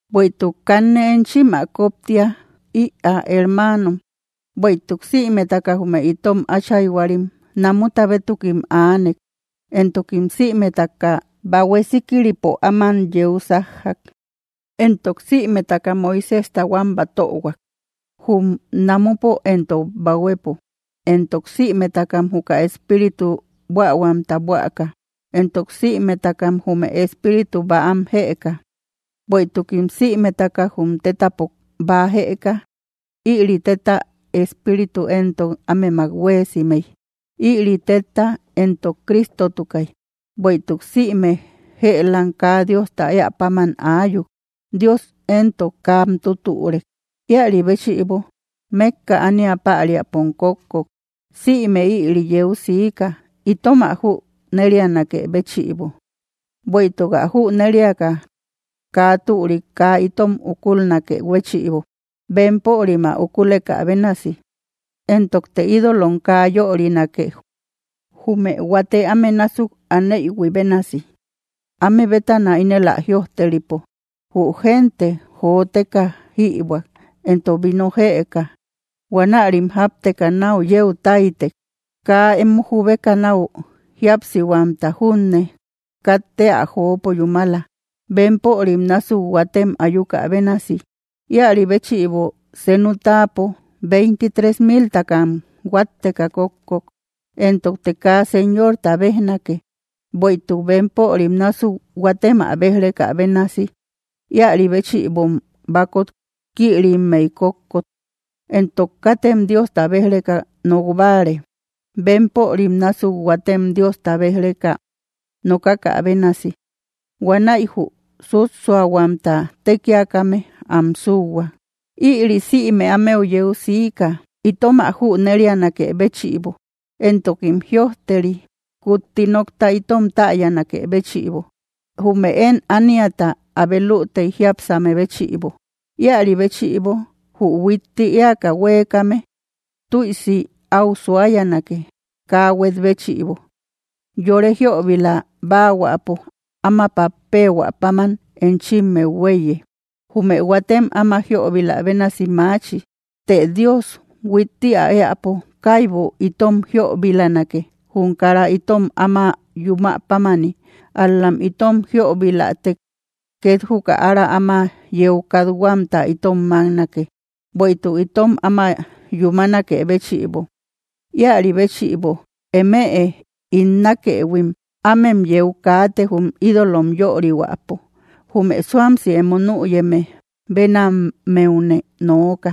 Bueïtuk kanne enchim ä koptia ïa hermanom, bueïtuk simetaka jume itom áchayhuarim namuta bétukim aanek, entokim sïmetaka bahue síkiripo áman yeu sajjak. Entok sïmeta Moiséjta huam batöhuak, jum namupo entok bahuepo, entok sïmetaka juka espíritu buähuamta buäka, entok sïmetaka jume espíritu bäam jëka; bueïtukim sïmetaka jum tetapo bäa jëka, ïri teta Espíritu entok ámemak huéesimey, ïri tetta entok Cristotukay. Bueïtuk sïme jeelaam kaa Diosta eä paman ayuk, Dios entok kam tüturek, ïari béchïbo mekka ánia pariapom kókkok. Siime ïri yeu sika itom ä jünerianakë béchïbo, bueïtuk ä júneriaka kaa türik kaa itom ukulnakë béchïbo, bempörim ä ukulekä bénasi. Entokte ídolom kaa yörinake, jume huate áme násuk aneïhui bénasi, áme bétana ínel ä jïojteripo: “Jü gente joteka jibuak entok víno jeeka, huanärim japteka nau yeu taiytek.” Kaa emo jubeka nau jíapsihuamta junne katte ä joopo yúmala, bempörim násuk huatem ayuka bénasi, ïari béchïbo senu táapo veintitrés miltakam huatteka kókkok. Entokte kaa Señorta bejnake, bueïtuk bempörim nasuk huatem ä bej-rekä bénasi, ïari béchïbom bakot kïrimmey kókkok. Entok katem Diosta bej‑reka nokbare, bempörim násuk huatem Diosta bej‑reka nokakä bénasi, huanäi jü sússuahuamta tekiakame am sühuak. Ïrí sïme ámeu yeu siika itom ä jünerianakë béchïbo, entokim jïojteri, kutti nokta itom täyanakë béchïbo, jume én ániata abe lütey jiápsame béchïbo. Ïaribéchïbo, jü huitti eäka huekame, tüisi au suayanake kaa huet béchïbo. Yore jiöbila báahuäpo áma pappehuä páman enchimmeu huéiye, jume huatem ama jiöbilahuakä bénasi maachi. Të Dios huitti ä éäpo kaibu itom jiobilanake jum kara itom áma yumä pámani, ál‑la itom jiobilatek ket juka ára áma yeu kathuamta itom maknake, bueïtuk itom áma yúmanakë béchïbo. Ïari béchïbo, emëe ín nakëhuim, ámem yeu kaate jum ídolom yörihuäpo. Jume suamsi emo nüyeme benammeune nooka,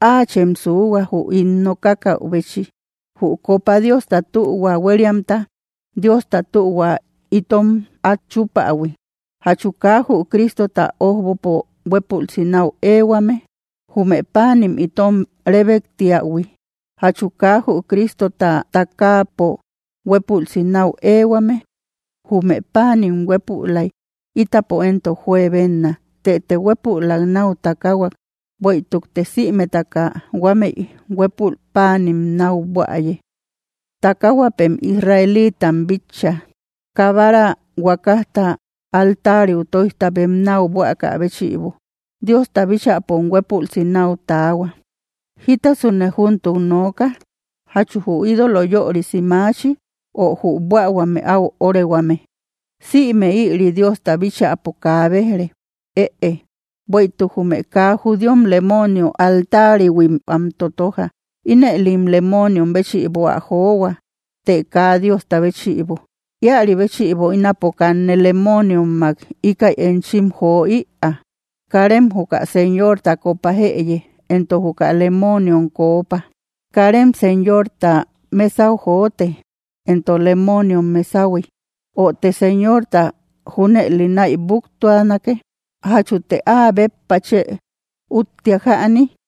áachem suhua jü ín nokakaubechi. Jü kopa Diosta tühua hueriamta, Diosta tühua itom at chupahui, ¿jachu kaa jü Cristota ojbopo huepulsi nau ehuame? Jume panim itom rebektiahui, ¿jachu kaa jü Cristota takaapo huepulsi nau ehuame? Jume paanim huépülay, ítapo entok juebenna, tetë huépülak nau takahuak; bueïtukte sïmetaka huamey huepul paanin nau buäye. Takahuapem Israelitam bitchä; kabara huakasta altariu toijta bem nau buäkä béchïbo, Diosta bíchäpom huepulsi nau taahua. ¿Jítasune júntuk nooka? ¿Jachu jü ídolo yörisi maachi, ö jü buähuame áu órehuame? Sïme ïri Diosta bíchäpo kaa bejre. Ëe, bueïtuk jume kaa judíom lemonio altarihuim ä totoja, inëlim lemoniom béchïbo ä johua, të kaa Diosta béchïbo, ïari béchïbo ínapo kanne lemoniommak íkäi enchim jo‑ïa. Karem juka Señorta kopa jëye, entok juka lemoniom koopa, karem Señorta mesau jotë, entok lemoniom mesahui. ¿Ö te Señorta júneli naïbuktuanake? ¿Jachute áa béppa chë ütiak jäni?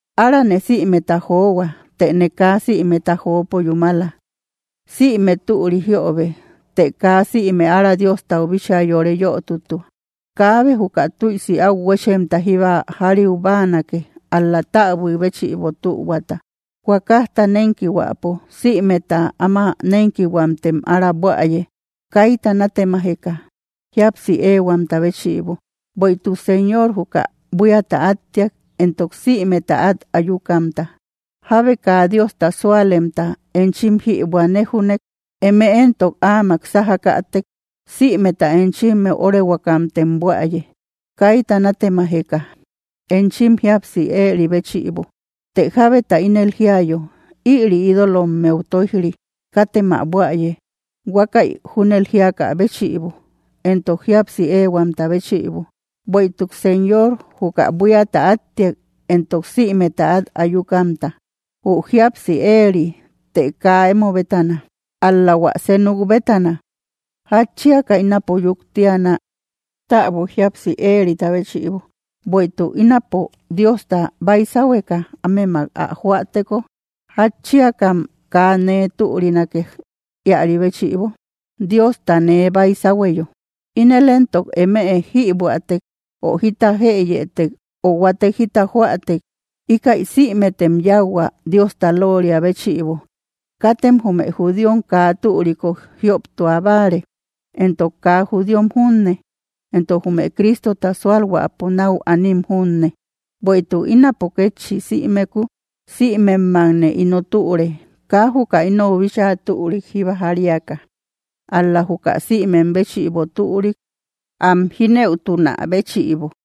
Árane sïmeta johua, tëne kaa sïmeta jopo yúmala; sïme türi jiobe, të kaa sïme ára Diostau bíchaa yore yotütua. Kaabe juka tüisi au huechemta jíba jariubanake, ál‑la, täbuik béchïbo tühuata. Huakajta nenkihuäpo, simeta áma nenkihuamtem ára buäye, kayta natemajeka, jíapsi ehuamta béchïbo; bueïtuk Señor juka buíata attiak entok sïmeta at ayukamta. Jábe kaa Diosta sualemta enchim jibua néjunëk, eme entok áman sajakätek, sïmeta enchimmeu orehuakamtem buäye, kayta natemajeka, enchim jíapsi eri béchïbo. Të jabeta ínel jiayo: “Ïri ídolommeu toijri”, katem ä buäye, huakay junël jiaka béchïbo, entok jíapsi ehuamta béchïbo; bueïtuk Señor juka buíata attiak entok sïmeta at ayukamta. Jü jíapsi eri, të kaa emo bétana. Ál‑la huä senuk bétana: “¿Jatchiaka ínapo yuktiana, täbui jíapsi erita béchïbo? Bueïtuk ínapo Diosta báysahueka ámemak ä joäteko, ¿jatchiakam kaa nee türinake iäri béchïbo, Diostane báysahueyo?” Ínel entok eme jïbuätek ö jita jëyetek ö huatek jita joätek, íkäi sïmetem yáuhua Diosta looria béchïbo. Katem jume judíom kaa türiku jioptua báare, entok kaa judíom junne, entok jume Cristota sualhuäpo nau anim junne. Bueïtuk ínapo kétchi sïmeku, simemmakne ino türe, kaa juka inou bíchaa türik jíba jariaka, ál‑la juka sïmem béchïbo türik, am jinëutunä béchïbo.